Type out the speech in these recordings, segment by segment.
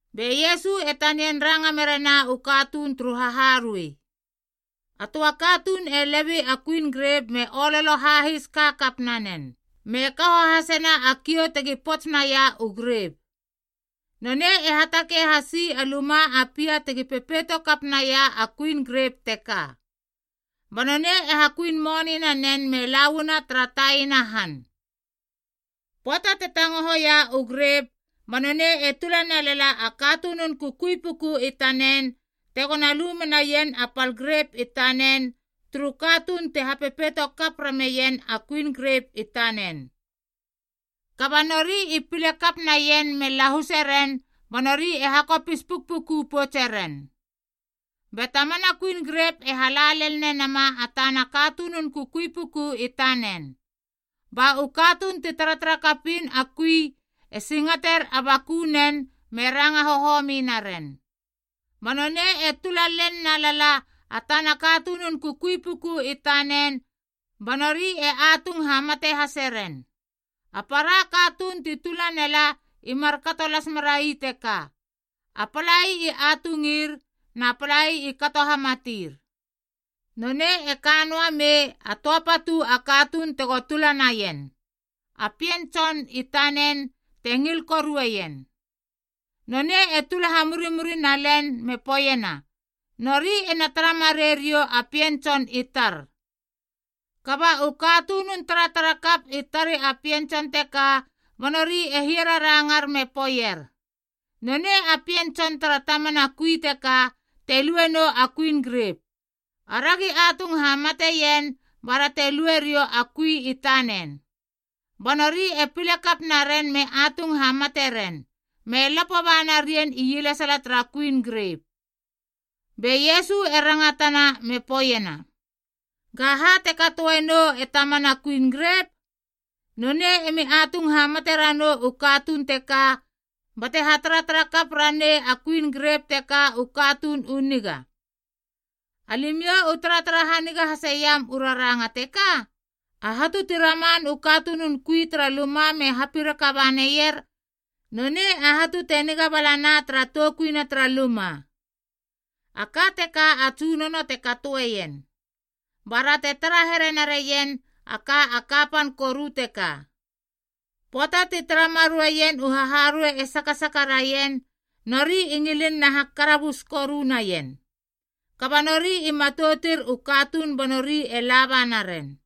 Be Iesu e tanian ranga merena u katuun turu haharuei. “A töa katuun e lebei a kuin grep me ololo hahis kakap nanen, me kaho hasena a kiou tegi pots naia u grep. Nonei e hatakei hasi a luma a pia tegi pepeito kap naia a kuin grep teka. Ba nonei e hakuin moni nanen me lauana tara taina a han. Pöata te tangohoia u grep ba nonei e tula nelala a katunun kukui puku i tanen tegona lu menaien a pal grep i tanen turu katuun te hapepetokap rameien a kuin grep i tanen. Kaba nori i pile kap naien me lahuse ren ba nori e hakopis pukpuku poutse ren. Be tamana kuin grep e hala lel nenama a tana katunun kukui puku i tanen, ba u katuun ti taratarakapin a kui e singater a bakunen me ranga hohomi naren. Ba nonei e tula lel nalala a tana katunun kukui puku i tanen ba nori e atung hamate haseren. A para katuun ti tula nela i markato las merai teka, a palai i atungir na palai i kato hamatir. Nonei e ka noa mei a töa patu a katuun tego tula naien, a pien tson i tanen te ngil korueien. Nonei e tula hamurimuri nalen me poeiena, ‘Nori ena tara marei riou a pien tson i tar.’ “Kaba u katunun taratarakap i tari a pien tson teka, ba nori e hiararangar me poeier, ‘Nonei a pien tson tere tamana kui teka te lue nou a kuin grep. Aragi atung hamateien bara te lue riou a kui i tanen.’ Ba nori e pile kap naren me atung hamate ren me lapo ba narien ielesala tara kuin grep.” Be Iesu e rangatana me poeiena, “Gaha te katoe nou e tamana kuin grep? Nonei emi atung hamate ranou u katuun teka bate hataratara kap ranei a kuin grep teka u katuun u niga. Alimiou u taratara haniga haseiam u raranga teka? ‘A hatu ti raman u katunun kui tara luma me hapiraka ba naier, nonei a hatu te niga balana tara toukuina tara luma. A ka teka a Tsunono te katoeien, bara te tara here narien a ka a kapan koru teka.’” Pöata ti tara mareien u haharuei e sakasaka raien, nori i ngilin na hakarabus koru naien. Kaba nori i matoutir u katuun ba nori e laba naren.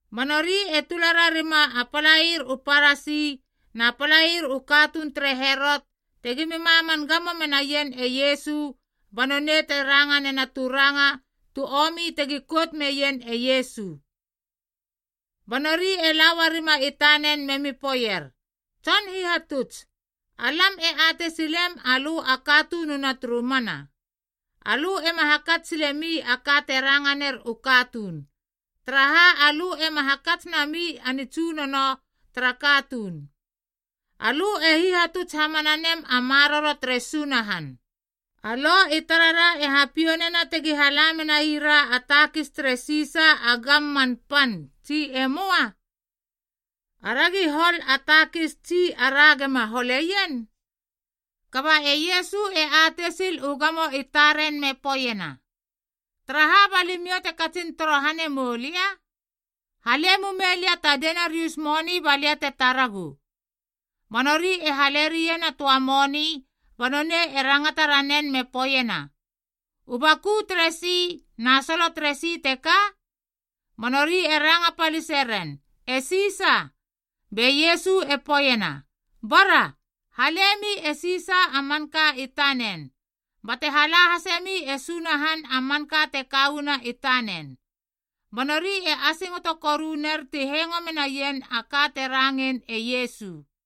Ba nori e tula rarima a palair u Parasi na palair u katuun tere Herot tegimi maman gamo menaien e Iesu ba nonei te ranga nena tu ranga tu omi tegi kout meien e Iesu. Ba nori e la uarima i tanen memi poeier, “Tson Hihatuts, alam e atei silem alö a katununa turu mana. Alö ema hakats silemi a ka te ranga ner u katuun, taraha alö ema hakats nami a nitsunono tara katuun. Alö e hihatuts hamana nem a maroro tere Sunahan. Bara, a Lo i tarara e hapiou nena tegi hala menai ra a takis tere Sisa a gamman pan, tsi e möa? Aragi hol a takis tsi ara gima holeien?” Kaba e Iesu e atei sil u gamo i taren me poeiena, “Taraha ba limiou te katsin torohane mou lia? Hale mume lia ta denariusa moni ba lia te taragu.” Ba nori e hale rien a töa moni ba nonei e rangata ranen me poeiena, “U baku teresi na solo teresi teka?” Ba nori e ranga palise ren, “E Sisa.” Be Iesu e poeiena, “Bara, halemi e Sisa a manka i tanen, bate hala hasemi e Sunahan a manka te ka uana i tanen.” Ba nori e asingoto koru ner ti hengo menaien a ka te rangein e Iesu.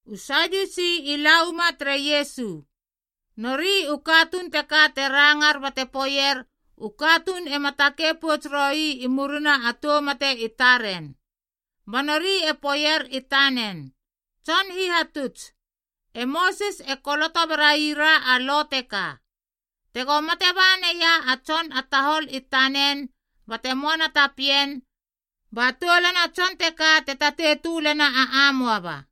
U Sadiusi i la uama tere Iesu. Nori u katuun teka te rangar bate poeier u katuun ema takei pouts roi i murina a tou mate i taren. Ba nori e poeier i tanen, “Tson Hihatuts, e Mosis e koloto berai ra a lo teka: ‘Tego mate ba naia a tson a tahol i tanen bate moana ta pien, ba toulana tson teka te tatei tölena a amoaba,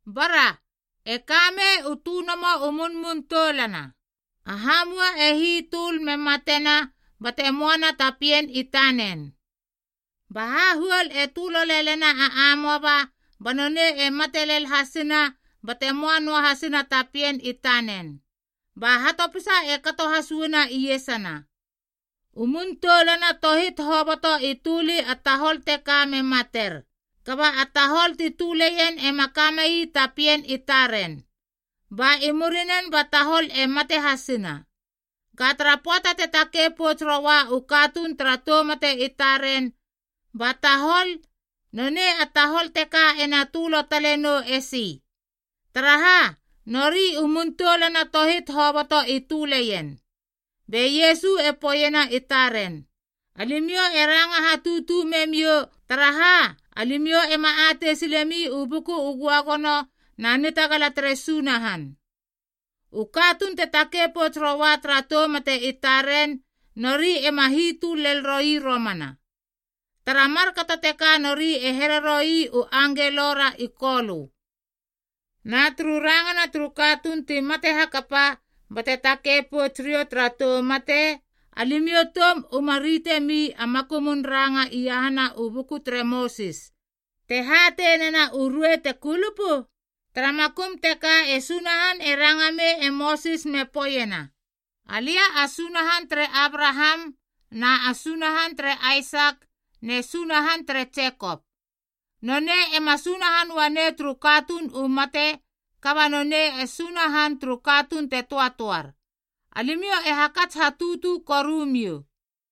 Bara, e ka mei u tönomo u munmun toulana. A hamua e hitöl me matena bate möana ta pien i tanen. Ba hahuol e tölo lelena a amoaba ba nonei e mate lel hasina bate möa noa hasina ta pien i tanen. Ba hatopisa e kato has uana iesana. U mun toulana tohit hoboto i töli a tahol teka me mater, kaba a tahol ti töleien ema kamei ta pien i taren. Ba i murinen ba tahol e mate hasina. Ga tara pöata te takei pouts roua u katuun tara tou mate i taren, ba nonei a tahol teka ena tölo tale nou esi? Taraha, nori u mun toulana tohit hoboto i töleien.” Be Iesu e poeiena i taren, “Alimiou e ranga hatutu memiou, taraha, alimiou ema atei silemi u Buku u Göagono na nitagala tere Sunahan. U katuun te takei pouts roua tara tou mate i taren, nori ema hitöl lel roi romana. Tara markato teka nori e here roi u angelo ra i Kolö. Na turu rangana turu katuun ti mate hakapa bate takei pouts riou tara tou mate, alimiou toum uma ritemi a makumun ranga iahana u buku tere Mosis te hatei nena u ruei te kulupu? Tara makum teka e Sunahan e ranga mei e Mosis me poeiena, ‘Alia a Sunahan tere Abraham na a Sunahan tere Aisak ne Sunahan tere Jekop.’ Nonei ema Sunahan uanei turu katuun u mate kaba nonei e Sunahan turu katuun te töatöar. Alimiou e hakats hatutu korumiou.”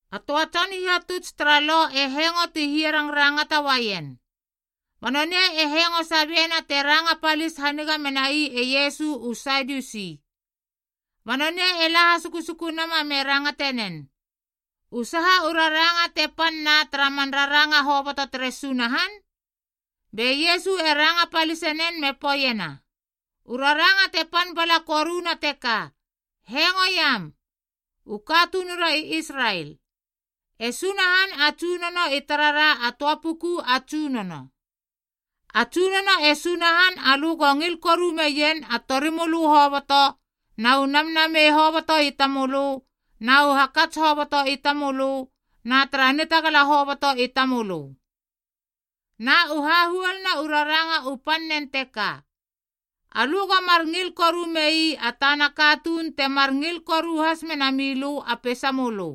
A töa tson hihatuts tara Lo e hengo ti hiarangrangata uaien. Ba nonei e hengo sabiena te ranga palis haniga menai e Iesu u Sadiusi, ba nonei e la hasukusuku nama me rangate nen, “U saha u raranga te pan na tara man raranga hoboto tere Sunahan?” Be Iesu e ranga palisenen me poeiena, “U raranga te pan bala koruna teka: ‘Hengoiam, u katunura i Israel, E Sunahan a Tsunono i tarara a töa puku a Tsunono. A Tsunono e Sunahan alö go ngil koru meien a tori mölö hoboto na u namnamei hoboto i tamölö na u hakats hoboto i tamölö na tara nitagala hoboto i tamölö.’ Na u hahuoluna u raranga u pannen teka: ‘Alö go mar ngil koru mei a tana katuun temar ngil koru has mena milö a peisamölö.’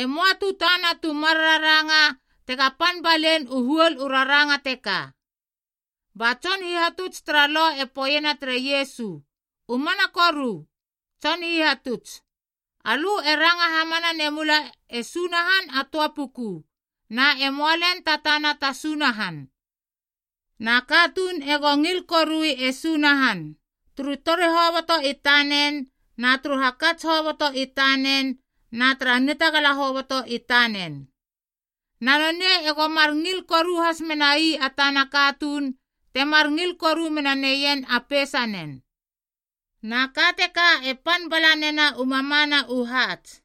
E möa tu tana tu mar raranga tega pan balein u huol u raranga teka.” Ba tson hihatuts tara Lo e poeiena tere Iesu, “U mana koru, Tson Hihatuts. Alö e ranga hamana nemula e Sunahan a töa puku, na e möa lel ta tana ta sunahan. Na katuun ego ngil korui e Sunahan turu tori hoboto i tanen na turu hakats hoboto i tanen na tara nitagala hoboto i tanen. Na nonei ego mar ngil koru has menai a tana katuun temar ngil koru mena neien a peisanen. Na ka teka e pan bala nena u mamana u haats.”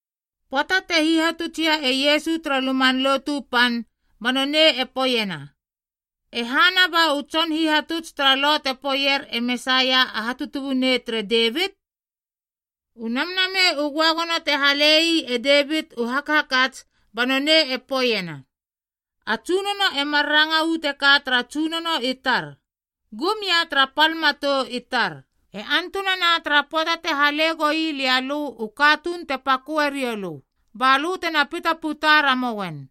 Pöata te hihatutsia e Iesu tara Luman Lotu Pan ba nonei e poeiena, “E hana ba u tson hihatuts tara Lo te poeier e Mesaia a hatutubunei tere Devit? U Namnamei u Göagono te hale ii e Davit u hakhakats ba nonei e poeiena, ‘A Tsunono e mar ranga uu teka tara Tsunono i tar, Gum ia tara pal matou i tar, e antunana tara pöata te hale goi lia lö u katuun te paköe rioulö ba lö tena pita puta ramouen.’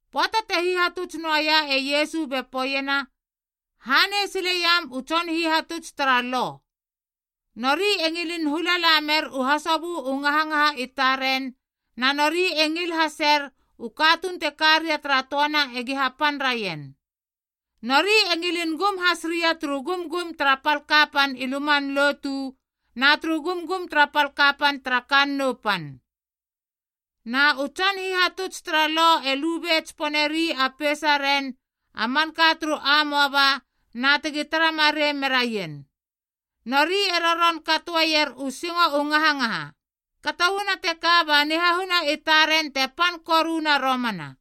Pöata te hihatuts noaia e Iesu be poeiena, “Hanei sileiam u tson hihatuts tara Lo. Nori e ngilin hula la mer u hasobö u ngahangaha i taren, na nori e ngil haser u katuun te ka ria tara töana egi hapan raien. Nori e ngilin gum has ria turu gumgum tara pal kapan i luman lotu na turu gumgum tara pal kapan tara kannou pan. Na u tson hihatuts tara Lo e lube tsiponeri a peisaren a manka turu amoaba na tegi tara marei meraien, nori e roron katoeier u singo u ngahangaha. Kato uana teka ba nihahuna i taren te pan koruna romana.”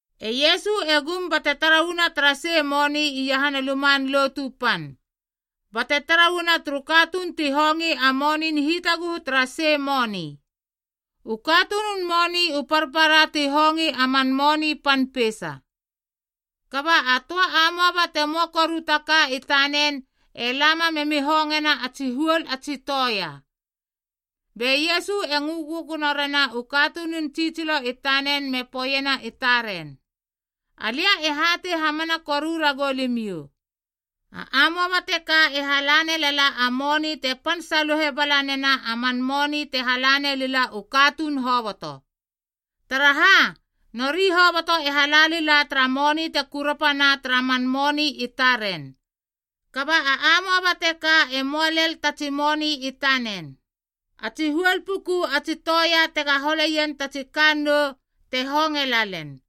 E Iesu e gum bate tara uana tara sei moni iahana Luman Lotu Pan, bate tara uana turu katuun ti hongi a monin hitaguhu tara sei moni. U katunun moni u parpara ti hongi a man moni pan peisa. Kaba a töa amoaba te möa koru ta ka i tanen e lama memi hongena a tsi huol a tsi toea. Be Iesu e ngö gögono rena u katunun tsitsilo i tanen me poeiena i taren, “Alia e hatei hamana koru ragou limiou, a amoaba teka e hala nelala a moni te pan saluhe bala nena a man moni te hala nelila u katuun hoboto. Taraha, nori hoboto e hala lila tara moni te kurapana tara man moni i taren, kaba a amoaba teka e möa lel ta tsi moni i tanen. A tsi huol puku a tsi toea tega holeien ta tsi kannou te honge la len.”